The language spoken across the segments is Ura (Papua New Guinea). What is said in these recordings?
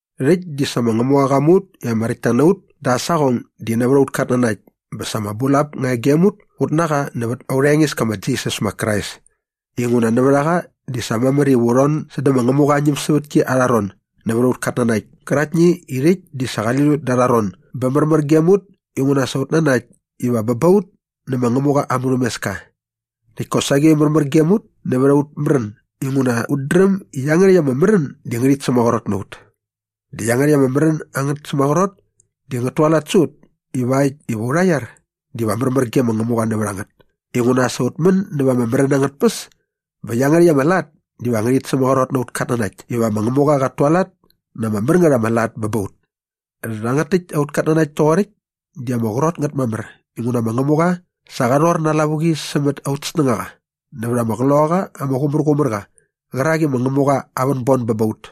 Rhäkt di sa ma Ngämuqa qa mu ut i ama räktta na ut da aa saqong di nävät aut katnanakt bä sa ama bulap nga e gem ut ut na qa nävät aurha Engeska ma Jisas ma Krais inguna nävät a qa di sa mamär iva u rhon sädä ma Ngämuqa aa ñämsävätki arha ron nävät aut katnanakt käraktni i rhäkt di sa qali lut da arha ron bä märmär gem ut inguna sa ut nanakt iva bä ba ut nä ma Ngämuqa aa murhämeska. Näkt kosaqi märmär gem ut nävät aut märän inguna ut dräm i iangärhäkt ama märän di ngärhit sämaqrot na ut. Dä iangärhäkt ama märän angät sämaqrot di ngät tualat sä ut ivakt iva aurha iar diva märmär ge ma Ngämuqa nävät a ngät inguna sa ut män näva ama märän angät tpäs bä iangärhäkt ama lat diva ngärhit sämaqrot na aut katnanakt iva ma Ngämuqa qat tualat na ama mär ngät ama lat bä ba ut. Rhangät täkt aut katnanakt toqoräkt di ama qrot ngät mamär inguna ma Ngämuqa sa qa rhor na aa lavuqi sämät aut snängaqa nävät ama Qloqaqa ama Qumärqumärqa qärak i ma Ngämuqa aa vänbon bä ba ut.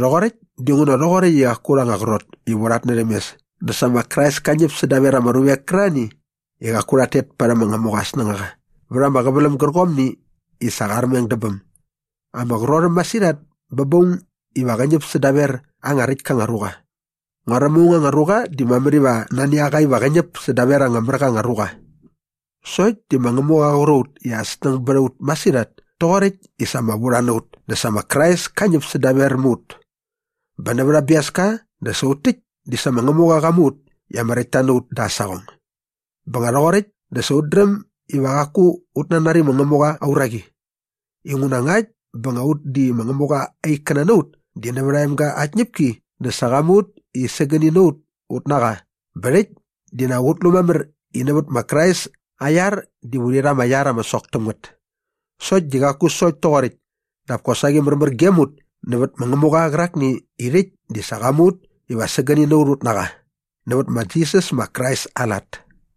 Rhoqoräkt dinguna rhoqoräkt i qaku aurha anga qrot iva u rhatnärhäm mes dä sa ma Krais ka ñäp sädaver ama ruvek kärarhani i qaku rhat tet parhäm ma Ngämuqa aa snängaqa vät ama qäväläm gärqomni i sa qa armeng dä bäm. Ama qrot äm masirhat bä ba aung iva qä ñäp sädaver anga räkt ka anga ruqa. Nguaräm aung anga ruqa di mamär iva nani a qa iva qä ñäp sädaver anga mär qa anga ruqa. Sokt di ma Ngämuqa qa qur a ut i aa snäng bät a ut masirhat toqoräkt i sa ama vurha na ut dä sa ma Krais ka ñäp sädaver mä ut. Bä nävät aa biaska dä sa ut täkt di sa ma Ngämuqa qa mu ut i ama räktta na ut dä aa saqong. Bä nga rhoqoräkt dä sa ut dräm iva qaku ut nanari ma Ngämuqa aa uraqi inguna ngakt bä nga ut di ma Ngämuqa aa ikkäna na ut di nävät aa emga aa tñäpki dä sa qa mu ut i sägäni na ut ut na qa bä rhäkt di nak ut lu mamär i nävät ma Krais aa iar diva urhi rha ama iar ama sok täm ngät. Sokt di qaku sokt toqoräkt dap kosaqi märmär gem ut nävät ma Ngämuqa qärakni i rhäkt di sa qa mu ut iva sägäni na ut ut na qa nävät ma Jisas ma Krais aa lat.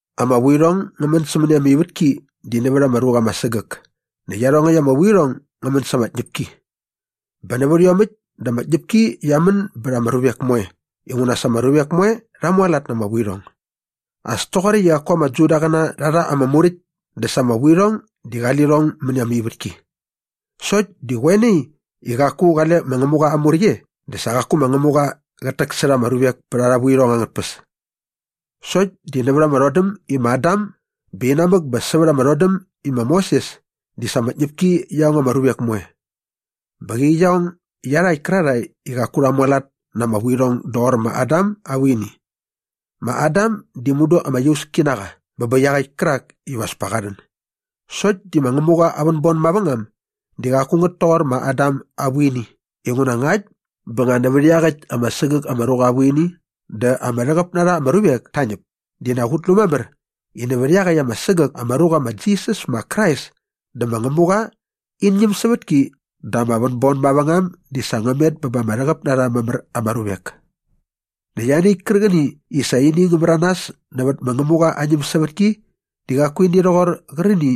Ama vuirhong ngä män sämäni ama ivätki di nävät ama ruqa ama sägäk näkt iarhongäkt ama vuirhong ngä män sa ama tñäpki. Bä nävät iomäkt dä ama tñäpki qia män bät ama ruvek moe inguna sa ama ruvek moe rha mualat na ama vuirhong. As toqoräkt i qaku ama Judaqäna rha rha ama Muräkt dä sa ama vuirhong di qali lirhong mäni ama ivätki. Sokt di qoe nai i qaku qale ma Ngämuqa aa Muräkt e dä sa qaku ma Ngämuqa qät täksärha ama ruvek pät arha vuirhong angät tpäs. Sokt di nävät ama rhodäm i ma Adam bä inamäk bä sävät ama rhodäm i ma Moses di sa ama tñäpki qia ong ama ruvek moe. Bä qäqi qia ong iarhakt kärarhae i qaku rha mualat na ama vuirhong doqor ma Adam aa vuini. Ma Adam di mudu ama iauski na qa bä bä iaqäkt kärak iva as pa qa rhän. Sokt di ma Ngämuqa aa vänbon mavängam di qaku ngät toqor ma Adam aa vuini inguna ngakt bä nga nävät iaqäkt ama sägäk ama ruqa aa vuini dä ama rhäqäp na rha ama ruvek ta ñäp di nak ut lu mamär i nävät iaqäkt ama sägäk ama ruqa ma Jisas ma Krais dä ma Ngämuqa in ñämsävätki dä ama vänbon mavängam di sa ngä met bä ba ama rhäqäp na rha mamär ama ruvek. Näkt ianiäkt kärqäni i sa ini ngä märanas nävät ma Ngämuqa aa ñämsävätki di qaku ini rhoqor qärqäni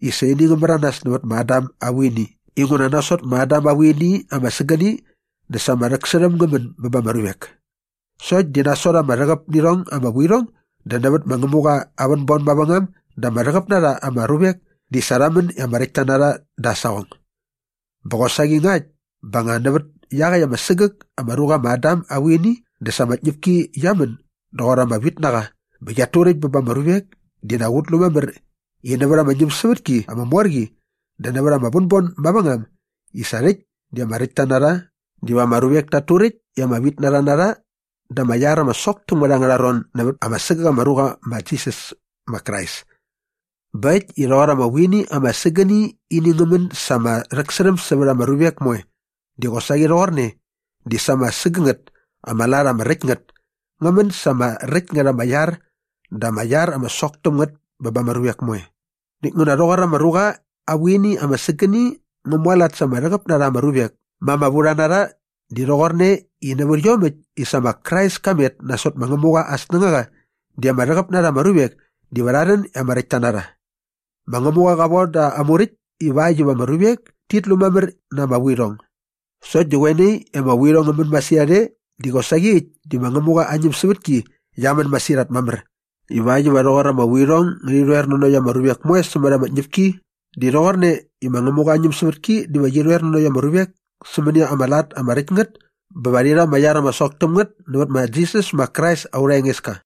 i sa ini ngä märanas nävät ma Adam aa vuini inguna nasot ma Adam aa vuini ama sägäni dä sa ama rhäksärhäm ngä män bä ba ama ruvek. Sokt di nasot ama rhäqäp nä irhong ama vuirhong dä nävät ma Ngämuqa aa vänbon mavängam dä ama rhäqäp na rha ama ruvek di sa rha män i ama räktka na rha da aa saqong. Bä qosaqi ngakt bä nga nävät iaqäkt ama sägäk ama ruqa ma Adam aa vuini dä sa ama tñäpki qia män doqor ama vitnaqa bä qiat turäkt bä ba ama ruvek di nak ut lu mamär i nävät ama ñämsävätki ama mor qi dä nävät ama vänbon mavängam i sa rhäkt di ama räktta na rha diva ama ruvek tat turäkt i ama vitnarha na rha da ama iar ama sok täm ngät angärha ron nävät ama sägäk ama ruqa ma Jisas ma Krais. Bä äkt i rhoqor ama vuini ama sägäni ini ngä män sa ama rhäksärhäm sävät ama ruvek moe di qosaqi rhoqorne di sa ama sägängät ama lat ama räkt ngät ngä män sa ama räkt ngät ama iar dä ama iar ama sok täm ngät bä ba ama ruvek moe. Näkt nguna rhoqor ama ruqa aa vuini ama sägäni ngä mualat sa ama rhäqäp na rha ama ruvek ma ama vurha na rha di rhoqorne i nävät iomäkt i sa ma Krais ka met nasot ma Ngämuqa aa snängaqa di ama rhäqäp na rha ama ruvek diva rha rhän i ama räktta na rha. Ma Ngämuqa qa von da ama Muräkt ivakt iva ama ruvek tit lu mamär na ama vuirhong. Sokt di qoe nai i ama vuirhong ngä män e masirhat di qosaqi äkt di sa ma Ngämuqa aa ñämsävätki qia män masirhat mamär ivakt iva rhoqor ama vuirhong ngärhi rhoer nanokt ama ruvek moe sämät ama tñäpki di rhoqorne i ma Ngämuqa aa ñämsävätki diva qi rhoer nanokt ama ruvek sämäni ama lat ama räkt ngät bä va rhi rha ama iar ama sok täm ngät nävät ma Jisas ma Krais aurha Engeska.